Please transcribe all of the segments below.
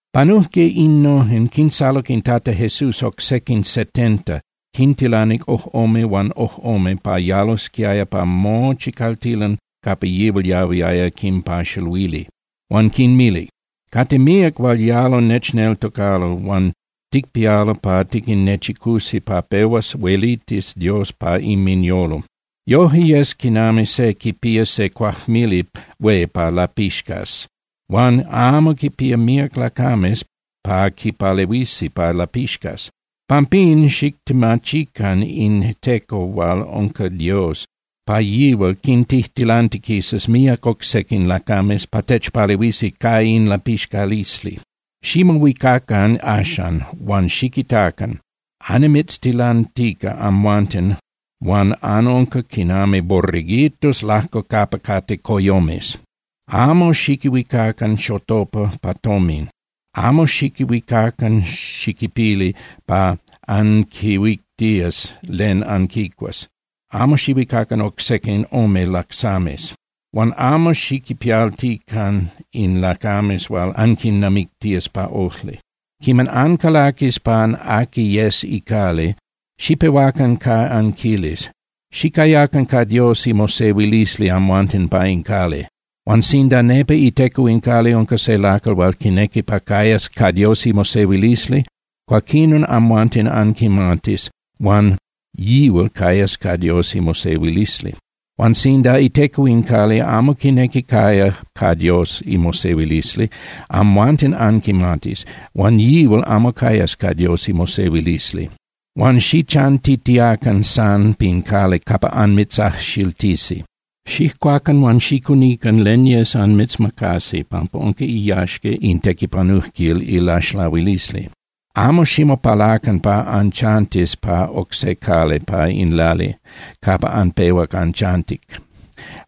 Panujque innojen, quinsaluc in Tata Jesús oc sequin setenta, quintilanic ojꞌome huan ojꞌome pa yalosquiaya pa mochi caltilan capa yihual yahuiaya quinpaxaluili. Huan quinmilic: —Cate míac hual yalo nechneltocalo huan ticpialo pa tiquinnechicusi pa pehuas huelitis Dios pa inminyolo. Yoje yes quinami se quipía se cuajmili hué pa lapixcas huan amo quipía míac lacames pa quipalehuisi pa lapixcas. Pampín xictemachican in Teco hual unca Dios pa yihual quintijtilantiquisas míac oc sequin lacames pa techpalehuisi ca in lapixcalisli. Ximohuicacan axan, huan xiquitacan: Annimitztilantica amhuanten huan anunca quinami borreguitos lajco capa cate coyomes. Amo xiquihuicacan xotopa pa tomin, amo xiquihuicacan xiquipili pa anquihuictías len anquicuas, amo xiquihuicacan oc sequin ome lacsames. Huan amo xiquinpialtitiacan in lacames hual anquinnamictías pa ojli. Quiman ancalaquis pan aqui yes icali, xipehuacan ca anquilis: “Xicayacan ca Dios imosehuilisli amhuanten pa in cali.” Huan sinda nepa iteco in cali unca se lacal hual quinequi pa cayas ca Dios imosehuilisli, cuaquinon amhuanten anquimatis, huan yihual cayas ca Dios imosehuilisli. Huan sinda iteco in cali amo quinequi caya ca Dios imosehuilisli, amhuanten anquimatis, huan yihual amo cayas ca Dios imosehuilisli. Huan xichantitiacan san pin cali capa anmitzajxiltisi. Xijcuacan huan xicunican len yes anmitzmacasi, pampa unca iyaxca in tequipanujquil ilaxlahuilisli. Amo ximopalacan pa anchantis pa oc se cali pa in cali capa anpehuac anchantic.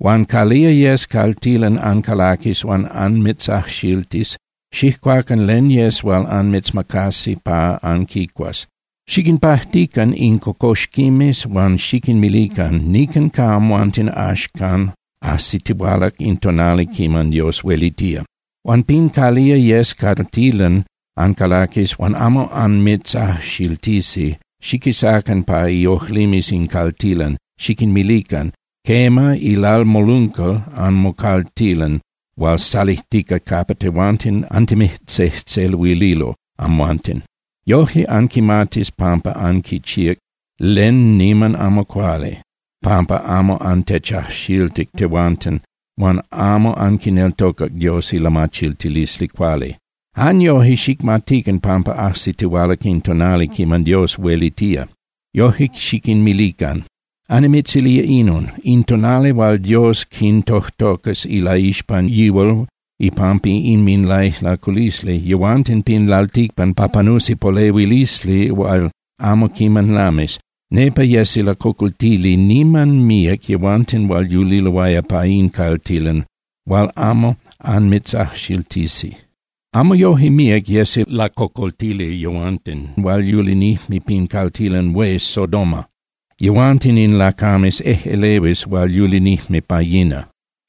Huan calía yes caltilan ancalaquis huan anmitzajxiltis, xijcuacan len yes hual anmitzmacasi pa anquicuas. Xiquinpajtican in cocoxquimes, huan xiquinmilican: “Nican ca amhuanten axcan ajsitihualac in tonali quiman Dios huelitía.” Huan pin calía yes caltilan ancalaquis huan amo anmitzajxiltisi xiquisacan pa iojlimes in caltilan, xiquinmilican: “Quema, ilalmoluncal anmocaltilan hual salijtica capa tehuanten antimijtzejtzeluililo amhuanten. Yoje anquimatis pampa anquichíac len niman amo cuali pampa amo antechajxiltic tehuanten huan amo anquineltocac Dios ilamachiltilisli cuali. Jan yoje, xicmatican pampa ajsitihualac in tonali quiman Dios huelitía.” Yoje xiquinmilican. Annimitzilía inon: In tonali hual Dios quintojtocas ilaixpan yihual ipampa inminlaijlaculisli yehuanten pin lalticpan pa panusi polehuilisli hual amo quiman lamis, nepa yesi lacocoltili niman míac yehuanten hual yuliloaya pa in caltilan hual amo anmitzajxiltisi. Amo yoje míac yesi lacocoltili yehuanten hual yulinijme pin caltilan hué Sodoma, yehuanten in lacames ejꞌelehuis hual yulinijme pa yina.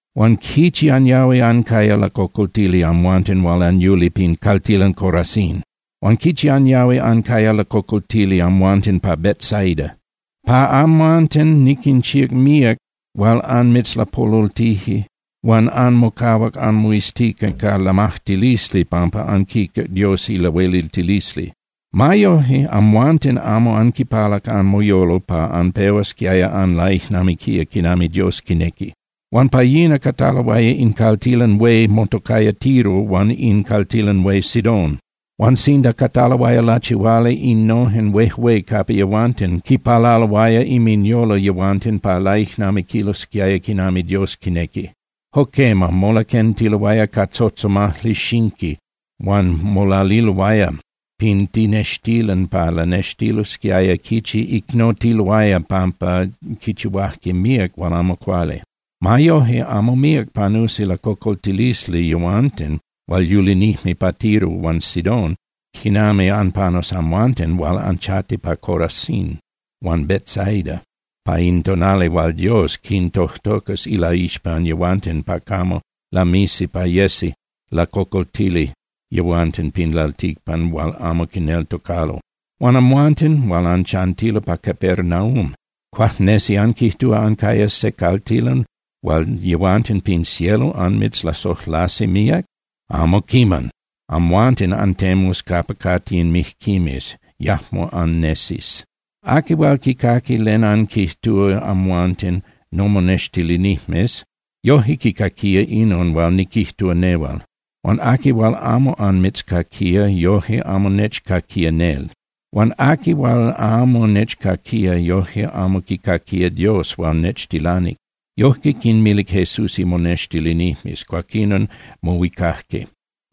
’Huan ¡quichi anyahui ancaya lacocoltili, amhuanten hual anyuli pin caltilan Corazín! Huan ¡quichi anyahui ancaya lacocoltili amhuanten pa Betsaida! Pa amhuanten niquinchíac míac hual anmitzlapolultije huan anmocahuac anmoiztica ca lamajtilisli pampa anquitac Dios ilahueliltilisli. Ma yoje, amhuanten amo anquipalac anmoyolo pa anpehuasquiaya anlaijnamiquía quinami Dios quinequi. Huan pa yina cataloaya in caltilan hué motocaya Tiro huan in caltilan hué Sidón. Huan sinda cataloaya lachihuali innojen huejué capa yehuanten, quipalaloaya inminyolo yehuanten pa laijnamiquilosquiaya quinami Dios quinequi. Jo quema, molaquentiloaya ca tzotzomajli xinqui huan molaliloaya pin tinextilan pa lanextilosquiaya quichi icnotiloaya pampa quichihuajque míac hual amo cuali. Ma yoje, amo míac panusi lacocoltilisli yehuanten hual yulinijme pa Tiro huan Sidón quinami anpanus amhuanten hual anchanti pa Corazín huan Betsaida pa in tonali hual Dios quintojtocas ilaixpan yihual pa camo lamisi pa yesi lacocoltili yehuanten pin lalticpan hual amo quineltocalo. Huan amhuanten hual anchanti pa Capernaum, ¿cuajnesi anquijtúa ancayas se caltilan hual yehuanten pin cielo anmitzlasojlasi míac? Amo quiman. Amhuanten antemus capa cate in mijquimes, yajmo annesis. ’Aqui hual quicaqui len anquijtúa amhuanten nomonextilinijmes yoje quicaquía inon hual niquijtúa nehual. Huan aqui hual amo anmitzcaquía, yoje amo nechcaquía nel. Huan aqui hual amo nechcaquía, yoje amo quicaquía Dios hual nechtilanic. Yojque quinmilic Jesús imonextilinijmes. Cuaquinon mohuicajque.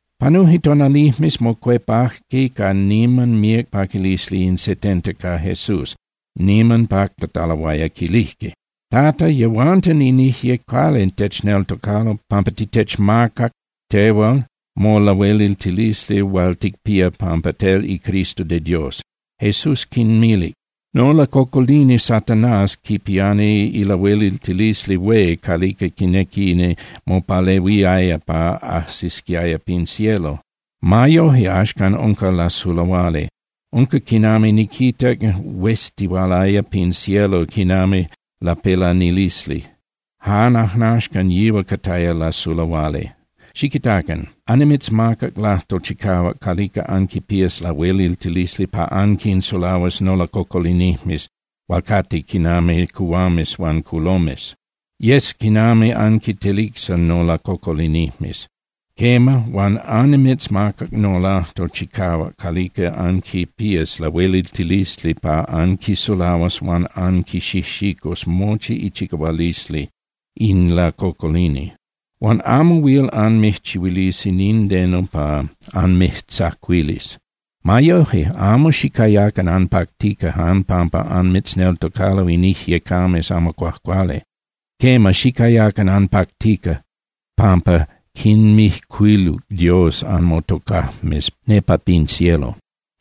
Panuje tonalijmes, mocuepajque ca niman míac paquilisli in setenta ca Jesús, niman pactataloaya, quilijque: —Tata, yehuanten in ijyecames amo cuajcuali techneltocalo pampa titechmacac tehual molahueliltilisli hual ticpía pampa tel iCristo de Dios. Jesús quinmilic: —Nolacocolini Satanás quipiani ilahueliltilisli hué calica quinequini mopalehuiaya pa ajsisquiaya pin cielo. Ma yoje, axcan unca lasulahuali. Unca quinami niquitac hueztihualaya pin cielo quinami lapelanilisli, jan ajnaxcan yihual cataya lasulahuali. Xiquitacan. Annimitzmacac lajtol chicahuac calica anquipías lahueliltilisli pa anquinsulahuas nolacocolinijmes hual cate quinami cuhuames huan culomes. Yes quinami anquintelicsa nolacocolinijmes. Quema, huan annimitzmacac nolajtol chicahuac calica anquipías lahueliltilisli pa anquisulahuas huan anquixijxicus mochi ichicahualisli in lacocolini. Huan amo huil anmijchihuilisi nindeno pa anmijtzacuilis. Ma yoje, amo xicayacan anpactica jan pampa anmitzneltocalo in ijyecames amo cuajcuali. Quema, xicayacan anpactica pampa quinmijcuiluc Dios anmotocajmes nepa pin cielo.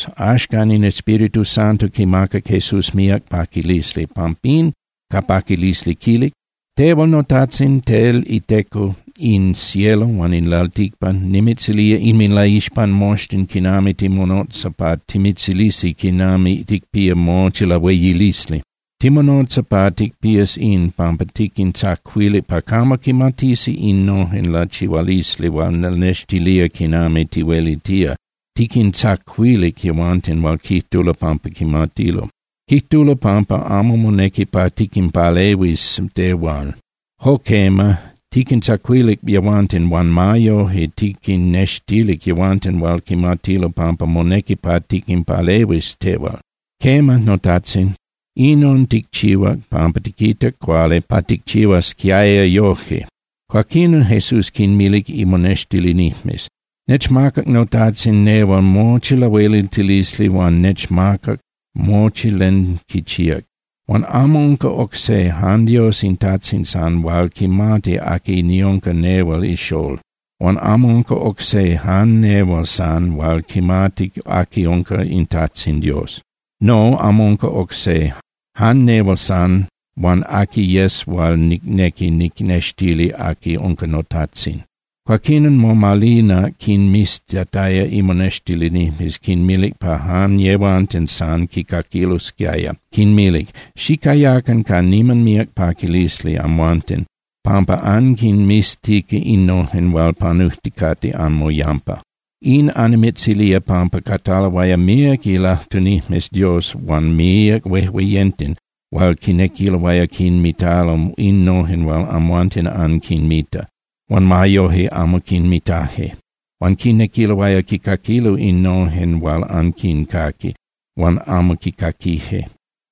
Axcan in Espíritu Santo quimacac Jesús míac paquilisli, pampín ca paquilisli quilic: —Tehual noTajtzin, tel iTeco in cielo huan in lalticpan, nimitzilía inminlaixpan moxtin quinami timonotza pa timitzilisi quinami ticpía mochi lahueyilisli. Timonotza pa ticpías in, pampa tiquintzacuilic pa camo quimatisi innojen lachihualisli hual lanextilía quinami tihuelitía, tiquintzacuilic yehuanten hual quijtulo pampa quimatilo. Quijtulo pampa amo monequi pa tiquinpalehuis tehual. Jo quema, tiquintzacuilic yehuanten huan ma yoje tiquinnextilic yehuanten hual quimatilo pampa monequi pa tiquinpalehuis tehual. Quema, noTajtzin, inon ticchihuac pampa tiquitac cuali pa ticchihuasquiaya yoje. Cuaquinon Jesús quinmilic imonextilinijmes: —Nechmacac noTajtzin nehual mochi lahueliltilisli huan nechmacac mochi len quichíac. Huan amo unca oc se, jan Dios in Tajtzin san hual quimati aqui niunca nehual ixól. Huan amo unca oc se, jan nehual san hual quimati aqui unca in Tajtzin Dios. No, amo unca oc se, jan nehual san huan aqui yes hual nicnequi nicnextili aqui unca noTajtzin. Cuaquinon momalinac quinmiztataya imonextilinijmes, quinmilic pa jan yehuanten san quicaquilosquiaya, quinmilic: —Xicayacan ca niman míac paquilisli amhuanten pampa anquinmiztica innojen hual panujticate anmoyampa. In annimitzilía pampa cataloaya míac ilajtunijmes Dios huan míac huejueyenten hual quinequiloaya quinmitalo innojen hual amhuanten anquinmita, huan ma yoje amo quinmitaje. Huan quinequiloaya quicaquilo innojen hual anquincaqui, huan amo quicaquije.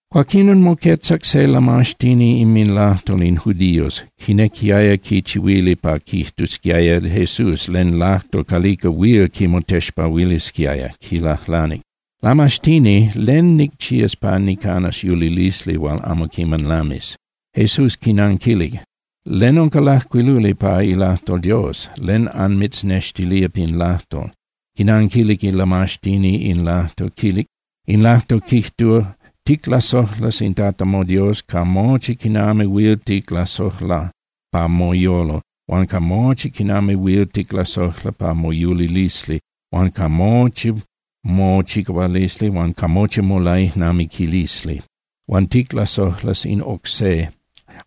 Cuaquinon moquetzac se ilamaxtini inminlajtol in judíos, quinequiaya quichihuili pa quijtusquiaya Jesús len lajtol calica huil quimotexpahuilisquiaya, quilajlanic: —Lamaxtini, ¿len nicchías pa nicanas yulilisli hual amo quiman lamis? Jesús quinanquilic: —¿Len unca lajcuiluli pa ilajtol Dios? ¿Len anmitznextilía pin lajtol? Quinanquilic ilamaxtini in lajtol, quilic: —In lajtol quijtúa: “Ticlasojlas in Tata moDios ca mochi quinami huil ticlasojla pa moyolo huan ca mochi quinami huil ticlasojla pa moyulilisli huan ca mochi mochicahualisli huan ca mochi molaijnamiquilisli. Huan ticlasojlas in oc se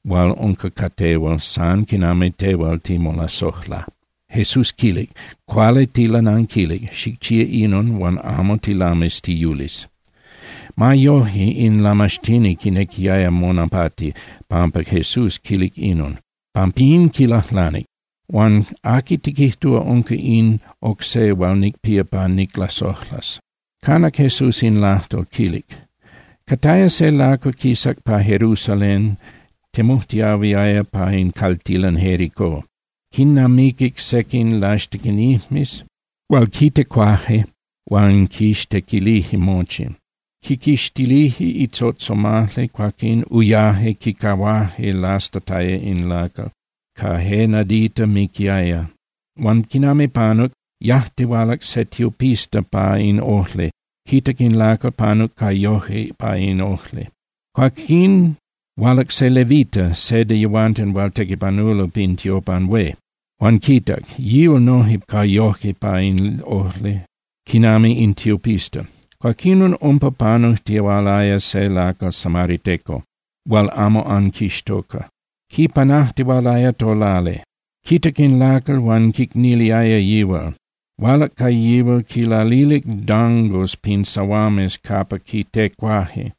hual unca ca tehual san quinami tehual timolasojla.” Jesús quilic: —Cuali tilananquilic. Xicchía inon huan amo tilamis tiyulis. Ma yoje, in lamaxtini quinequiaya monapati pampa Jesús quilic inon. Pampín quilajlanic: —Huan ¿aqui tiquijtúa unca in oc se hual nicpía pa niclasojlas? Canac Jesús in lajtol, quilic: —Cataya se lacal quisac pa Jerusalén, temujtiahuiaya pa in caltilan Jérico. Quinnamiquic sequin laxtequinijmes hual quitecuaje huan quixtequilije mochi, quiquixtilije itzotzomajli, cuaquín uyaje, quicahuaje lastataya in lacal, ca je nadita miquiaya. Huan quinami panuc, yajtihualac se tiopista pa in ojli, quitac in lacal, panuc ca yoje pa in ojli. Cuaquín hualac se levita (se de yehuanten hual tequipanulo pin tiopan hué), huan quitac. Yihual noje panuc ca yoje pa in ojli, quinami in tiopista. Cuaquinon umpa panujtihualaya se lacal samariteco hual amo anquixtoca. Quipanajtihualaya tolali. Quitac in lacal huan quicniliaya yihual. Hualac ca yihual, quinlalilic dangos pin sahuames capa quitecuaje,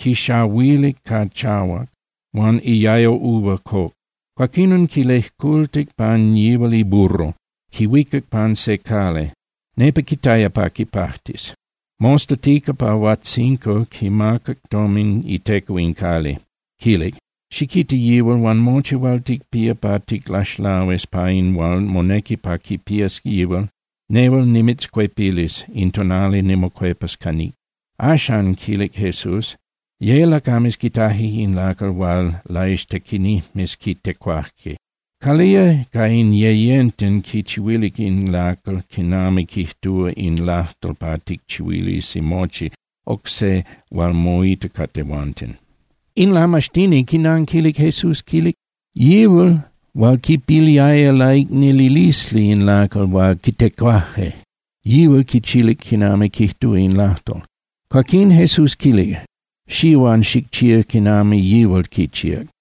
quinxahuilic ca chahuac huan iayo uva coc. Cuaquinon quilejcultic pan yihual iburro, quihuicac pan se cali, nepa quitaya pa quipajtis. Mostatica pa huajtzinco quimacac tomin iteco in cali, quilic: “Xiquita yihual huan mochi hual ticpías pa ticlaxlahuis pa in hual monequi pa quipías yihual, nehual nimitzcuepilis in tonali nimocuepas ca níc.” Axan —quilic Jesús—, ye lacames quitaje in lacal hual laixtequinijmes quitecuaje. ¿Calía ca in yeyenten quichihuilic in lacal quinami quijtúa in lajtol pa ticchihuilisi mochi oc se hual moita ca tehuanten? In lamaxtini quinanquilic Jesús, quilic: —Yihual hual quipiliaya laicnililisli in lacal hual quitecuaje, yihual quichihuilic quinami quijtúa in lajtol. Cuaquín Jesús quilic: —Xía huan xicchía quinami yihual quichíac.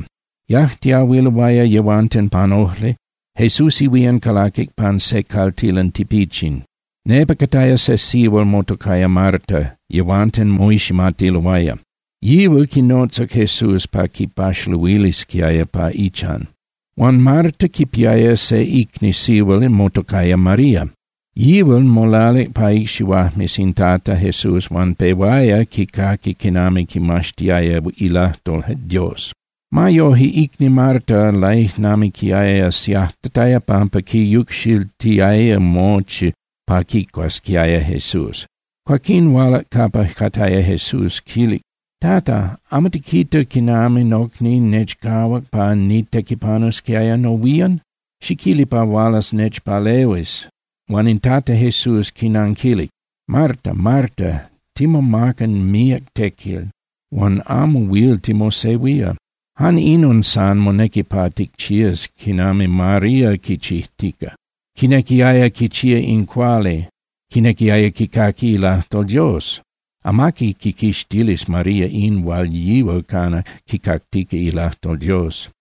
Yajtiahuiloaya yehuanten pan ojli, Jesús ihuían calaquic pan se caltilan tipichin, nepa cataya se sihual motocaya Marta, yehuanten moiximatiloaya. Yihual quinotzac Jesús pa quipaxaluilisquiaya pa ichan. Huan Marta quipiaya se icni sihual motocaya María. Yihual molalic pa icxihuajmes in Tata Jesús huan pehuaya quicaqui quinami quimaxtiaya ilajtol Dios. Ma yoje, icni Marta laijnamiquiaya siajtataya pampa quiyucxiltiaya mochi pa quicuasquiaya Jesús. Cuaquín hualac capa cataya Jesús, quilic: —Tata, ¿amo tiquita quinami nocni nechcahuac pa nitequipanusquiaya nohuían? Xiquili pa hualas nechpalehuis. Huan in Tata Jesús quinanquilic: —Marta, Marta, timomaca míac tequil huan amo huil timosehuía. Jan inon san monequi pa ticchías quinami María quichijtica. Quinequiaya quichía in cuali, quinequiaya quicaqui ilajtol Dios. Amaqui quiquixtilis María in hual yihual cana quicactica ilajtol Dios.